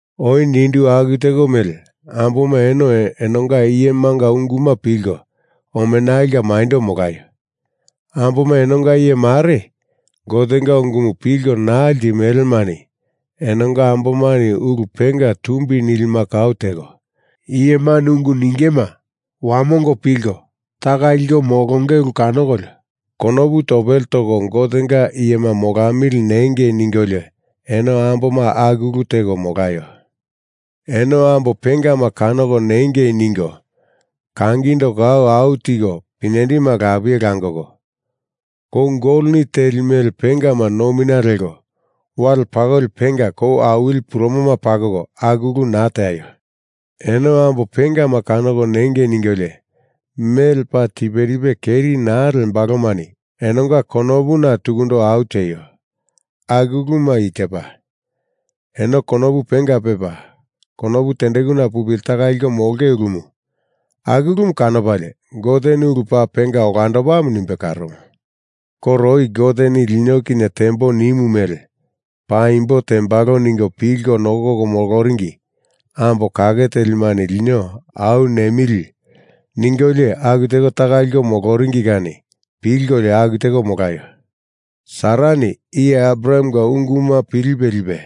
Oi nindu aku teko mele amboma eno enonga iyemanga unguma pilko omenalinga maindo molaio. Amboma enonga iye mare Gotenga ungumu pilko naa limelemani enonga ambomani ulu penga tumbi nilima kau teko, iyemani ungu ningema wamongo pilko taka liko molonge ulu kanokolio konopu topele toko Gotenga iyema molamili nengei ningolio eno amboma aku ulu teko molaio. Eno ambo pengama kanoko nengei ningo kangindo kau au tiko pinyendima lapie langoko, kou goloni teli mele pengama nomina leko, wale pakoli penga kou awili purumoma pakoko, aku ulu naa teaio. Eno ambo pengama kanoko nengei ningolio mele paa tiperipe keri naa lembalomani enonga konopuna tukundo au tieio. Aku uluma i tepa: Eno konopu penga pepa, konopu tendekuna pupili taka liko molonge ulumu. Aku ulumu kanopalie Goteni ulu paa penga olandopamu nimbe karomo. Koro oi Goteni lino kinye tembo nimo mele paimbo tembalo ningo pilko nokoko moloringi ambo kake telimani lino au nemili ningolio aku teko taka liko moloringi kani pilkolio aku teko molaio. Sarani iye Abrahamenga unguma pilipe lipe,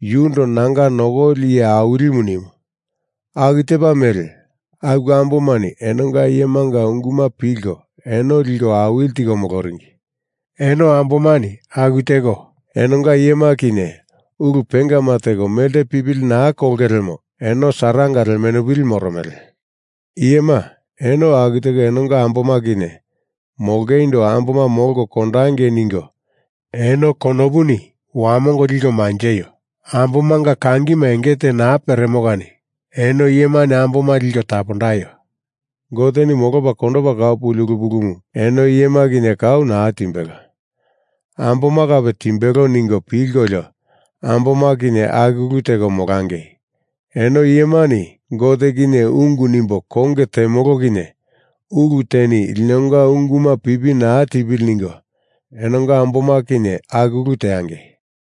yundo nanga nokoli iye awilimu nimu, aku tepa mele, aku ambomani enonga iyemanga unguma pilko eno liko awili tiko moloringi. Eno ambomani aku teko enonga iyema kinye ulu pengama teko melte pipili naa kolonge lemo eno Saranga lemenupili moromele. Iyema, eno aku teko enonga amboma kinye molongeindo amboma molko kondangei ningo eno konopuni wamongo liko manjeio. Ambomanga kangima enge te naa peremo kani eno iyemani amboma liko tapondaio. Goteni molopa kondopa kau puli ulu pulumu eno iyema kau naa timbelo. Amboma kape timbelola ningo pilkolio amboma kinye aku ulu teko molangei. Eno iyemani Gote kinye ungu nimbo konge temolo kinye ulu teni linonga unguma pipi na tipili ningo enonga amboma kinye aku ulu teangei.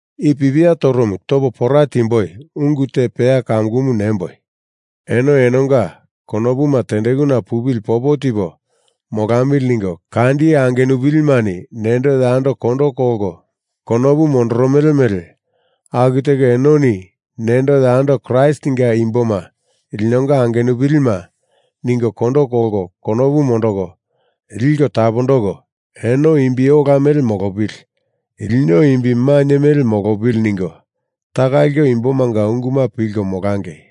I pipia toromu topo pora tiemboi, ungu te peya kamukumu nemboi. Eno enonga konopuma tendekuna pupili popo tipo molamili ningo kandi angenupilimani nendo yando kondo kolko konopu mondoromele mele aku teko enoni nendo yando Kraistinga imboma linonga angenupili ningo kondo kolko konopu mondoko, liko tapondoko, eno imbi ola mele molopili, lino imbi mainye mele molopili ningo taka liko imbomanga unguma pilko molangei.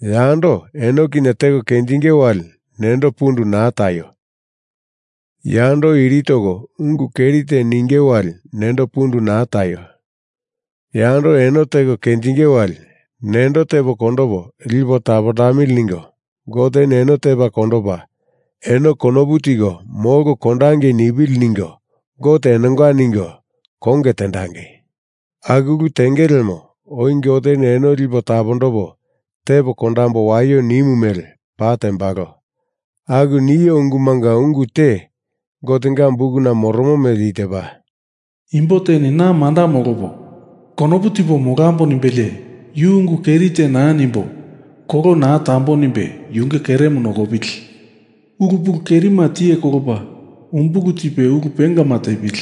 Yando eno kinye teko kenjinge wali nendo pundu naa taio! Yando iri toko ungu keri te ninge wali nendo pundu naa taio! Yando eno teko kenjinge wali nendo tepo kondopo lipo tapondamili ningo Goteni eno tepa kondopa, eno konopu tiko molko kondangei nipili ningo Gote enonga ningo konge tendangei. Aku ulu tenge lemo oi Goteni eno lipo tapondopo tepo kondambo waio nimu mele paa tembalo. Aku nio ungumunga ungu te Gotenga bukuna moromo mele i tepa: Imbo teni na manda molopo, konopu tipo molambo nimbelie yu ungu keri te naa nimbo, kolo naa tambo nimbe yunge keremu nokopili. Ulu pulu kerima tiye kolopa umbulu tipe ulu pengama tepili.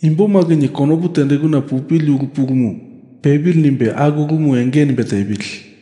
Imboma kinye konopu tendekuna pupili ulu pulumu pepili nimbe aku ulumu enge nimbe tepili.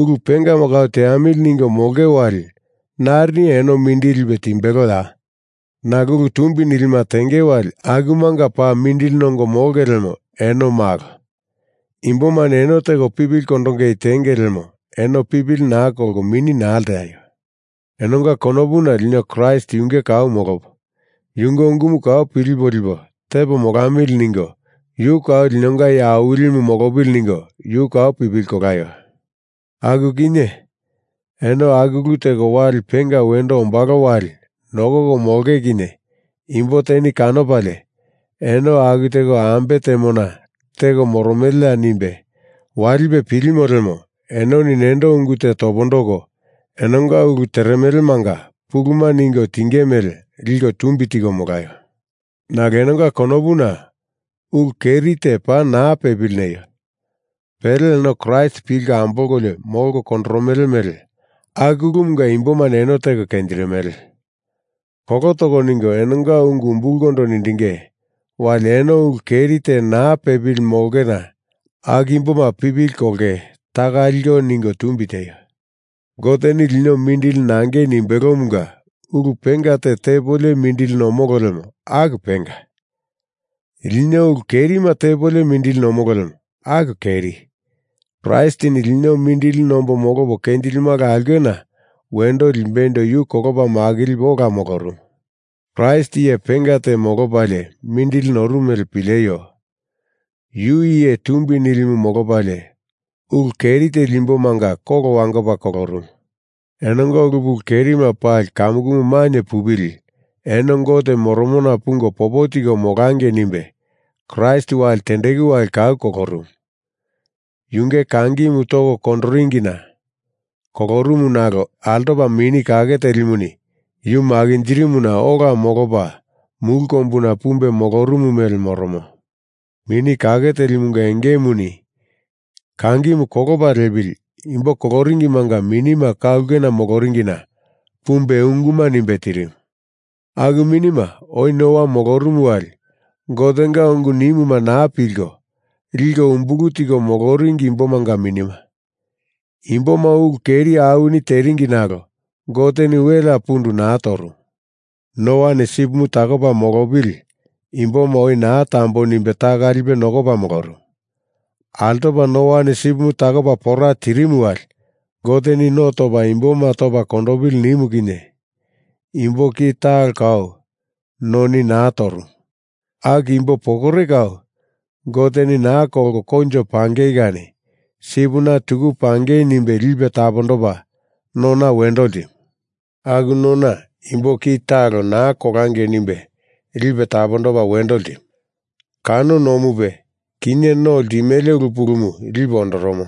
Ulu pengama kau teamili ningo molonge wali narini eno mindili lipe timbeloya? Nalo ulu tumbi nilima tenge wali akumanga paa mindili nongo molonge lemo eno malo. Imbomani eno teko pipili kondongei tenge lemo eno pipili na kolko mini naa lteaio. Enonga konopuna lino Kraist Yunge kau molopo, Yunge ungumu kau pilipo lipo tepo molamili ningo Yu kau linonga Iye Awilimu molopili ningo Yu kau pipili kolaio. Aku kinye eno aku ulu teko wali penga wendo ombalo wali nokoko molonge kinye imbo teni kanopalie, eno aku teko ambe temona teko moromeleya nimbe walipe pilimo lemo enoni nendo ungu te topondoko enonga ulu teremelemanga puluma ningo tinge mele liko tumbi tiko molaio. Nalo enonga konopuna ulu keri te paa naa pepili neio. Pele eno Kraist pilko ambolkolio molko kondoromele mele aku ulumunga imbomani eno teko kenjirimele. Kolo toko ningo enonga ungu umbulkondo nindinge wali eno ulu keri te naa pepili molongena aku imboma pipili kolongei taka liko ningo tumbi tieio. Goteni lino mindili nangei nimbelomunga ulu penga te tepolio mindili nomolo lemo aku penga. Lino ulu kerima tepolio mindili nomolo lemo aku keri. Kraistini Lino mindili nombo molopo kenjilimala aulkena wendo limbeindo yu kolopa makilipe ola molorumu. Kraist iye penga te molopalie mindili norumu mele pileio! Yu iye tumbi nilimu molopalie, ulu keri teli imbomanga kolo wangopa kolorumu. Enonga ulu pulu kerima pali kamukumu mainye pupili eno Gote moromona pungo popo tiko molangei nimbe Kraist wali tendeku wali kau kolorumu. Yunge kangimu toko kondoringina kolorumu nalo altopa Mini Kake Telimuni yu makinjirimuna ola molopa mulu kombuna pumbe molorumu mele moromo. Mini Kake Telimunga engemuni kangimu kolopa liepili imbo koloringimanga minima ka ulkena moloringina pumbe unguma nimbe tirimu. Aku minima oi Noa molorumu wali Gotenga ungu nimuma naa pilko, liko umbulu tiko moloringi imbomanga minima. Imboma ulu keri awini teringi nalo Goteni welea pundu naa torumu. Noani sipimu takopa molopili imboma oi naa tambo nimbe taka lipe nokopa molorumu. Altopa Noani sipimu takopa pora tirimu wali Goteni no topa imboma topa kondopili nimu kinye imbo ki talo kau noni naa torumu. Aku imbo pokore kau Goteni naa kolko koinjo pangei kani sipina tuku pangei nimbe lipe tapondopa nona wendo ltimu. Aku nona imbo ki talo naa kolangei nimbe lipe tapondopa wendo ltimu. Kano nomupe, kinye no ltimele ulu pulumu lipe ondoromo.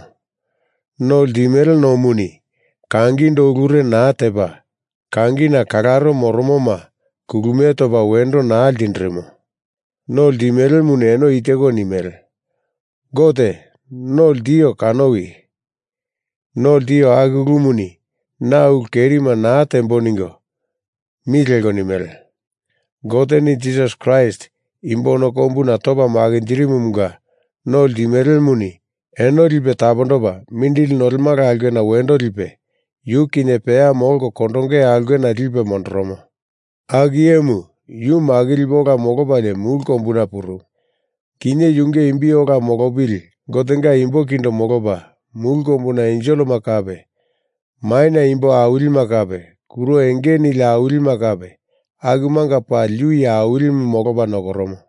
No ltimele nomuni kangindo ulure naa tepa, kangina kalaro moromoma kulumie topa wendo naa ltindirimo. No ltimelemuni eno i teko nimele: “Gote, no ltio kanowi. No ltio aku ulumuni na ulu kerima naa tembo,” ningo mi leko nimele. Goteni Jisas Kraist imbo ono kombuna topa makinjindirimumunga no ltimelemuni eno lipe tapondopa mindili nolemala aulkena wendo lipe, yu kinye peya molko kondonge aulkena lipe mondoromo. Aku iyemu Yu makilipe ola molopalie mulu kombuna purumu. Kinye yunge imbi ola molopili Gotenga imbo kindo molopa, mulu kombuna enselema kape, maina imbo awilima kape, kuro enge nili awilima kape, akumanga pali Yu iye Awilimu molopa nokoromo.